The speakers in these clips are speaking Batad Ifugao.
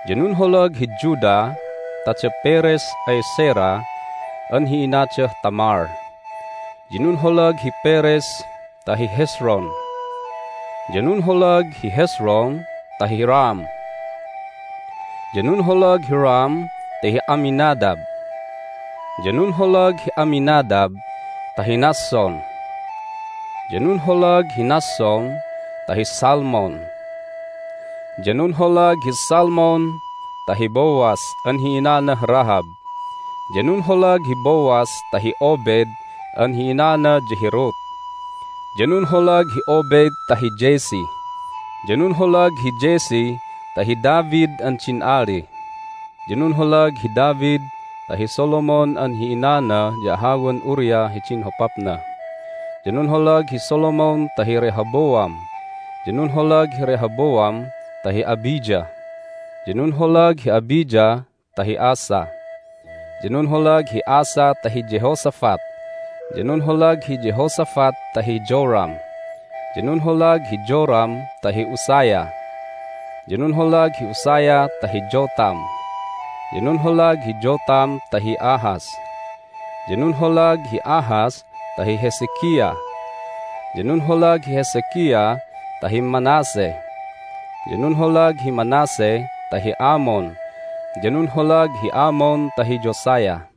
Ya nunholag hi Judah ta da Perez ay Zerah an hi inadah Tamar, ya nunholag hi Perez ta hi Hezron, ya nunholag hi Hezron ta hi Ram. Ya nunholag hi Ram ta hi Amminadab, ya nunholag hi Amminadab ta hi Nahshon, ya nunholag hi Nahshon ta hi Salmon. Ya nunholag hi Salmon ta hi Boaz an hi inanah Rahab, ya nunholag hi Boaz ta hi Obed an hi inana ya hi Ruth, ya nunholag hi Obed ta hi Jesse, ya nunholag hi Jesse ta hi David an din ali. Hi David hi Engganan Jehoiachin Ya nunholag hi David ta hi Solomon an hi inana ya ahawan Uriah hidin hopapna. Ya nunholag hi Solomon ta hi Rehoboam, ya nunholag hi Rehoboam ta hi Abijah, ya nunholag hi Abijah ta hi Asa. Ya nunholag hi Asa ta hi Jehoshaphat, ya nunholag hi Jehoshaphat ta hi Joram, ya nunholag hi Joram ta hi Uzziah. Ya nunholag hi Uzziah ta hi Jotham, ya nunholag hi Jotham ta hi Ahaz, ya nunholag hi Ahaz ta hi Hezekiah. Ya nunholag hi Hezekiah ta hi Manasseh, ya nunholag hi Manasseh ta hi Amon, ya nunholag hi Amon ta hi Josiah.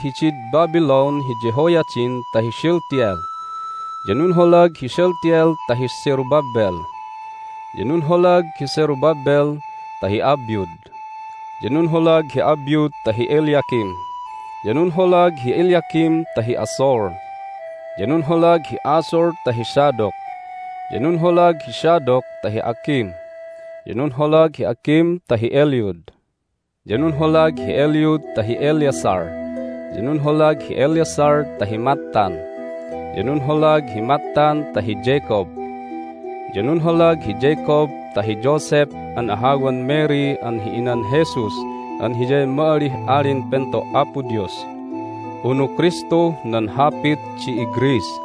Ya nunholag hidid Babylon hi Jehoiachin ta hi Shealtiel, ya nunholag hi Shealtiel ta hi Zerubbabel. Ya nunholag hi Zerubbabel ta hi Abiud, ya nunholag hi Abiud ta hi Eliakim, ya nunholag hi Eliakim ta hi Azor. Ya nunholag hi Azor ta hi Zadok, ya nunholag hi Zadok ta hi Akim, ya nunholag hi Akim ta hi Eliud. Ya nunholag hi Eliud ta hi Eleazar, ya nunholag hi Eleazar ta hi Matthan, ya nunholag hi Matthan ta hi Jacob. Ya nunholag hi Jacob ta hi Joseph an ahawan Mary an hi inan Jesus an Hiyay ma'alih Alin Pento' Apo Dios (unu Kristuh nan hapit di iGreece).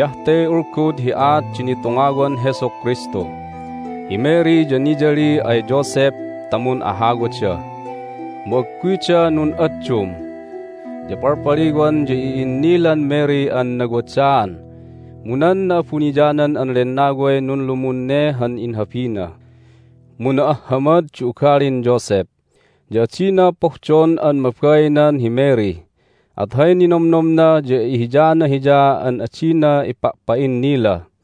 Hiyah te ulgud hi aat di nitungawan Jesu Kristu: hi Mary ya niyali ay Joseph ta mun'ahawada, mu agguyda nun'addum. Ya palpaliwan ya i'innilan Mary an nawadaan, mu nan Na'abuniyanan an Lennaway nunlumun ne han inhabina. Mu na'ahhamad di ugalin Joseph, ya adina pohdon an mabainan hi Mary, at hay ninomnomna ya ihiyana hiya an adina ipa'pa'innila.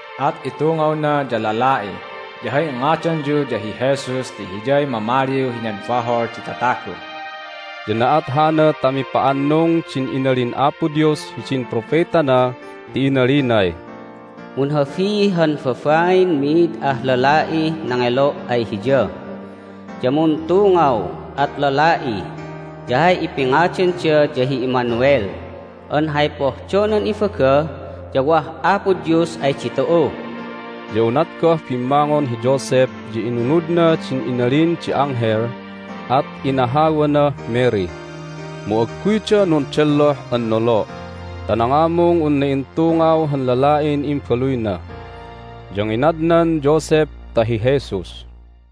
At itungawna, ya lala'i, ya hay ingadanyu ya hi Jesus ti Hiyay mamaliw hinan bahol di tatagu." Ya na'at hana ta mipa'annung din inalin Apo Dios hidin propetana ti inalinay, "Munhabi han babain mid ah lala'ih nangelo' ay hiya, ya muntungaw, at lala'i, ya hay ipingadanda ya hi Emmanuel an hay pohdonan ibaga ya wah Apo Dios ay ditu'u." Ya unat goh bimmangon hi Joseph ya inunudna din inalin di anghel, at inahawanah Mary. Mu agguyda nundelloh an nolo' ta nangamung unna intungaw han lala'in imbaluyna. Ya nginadnan Joseph ta hi Jesus.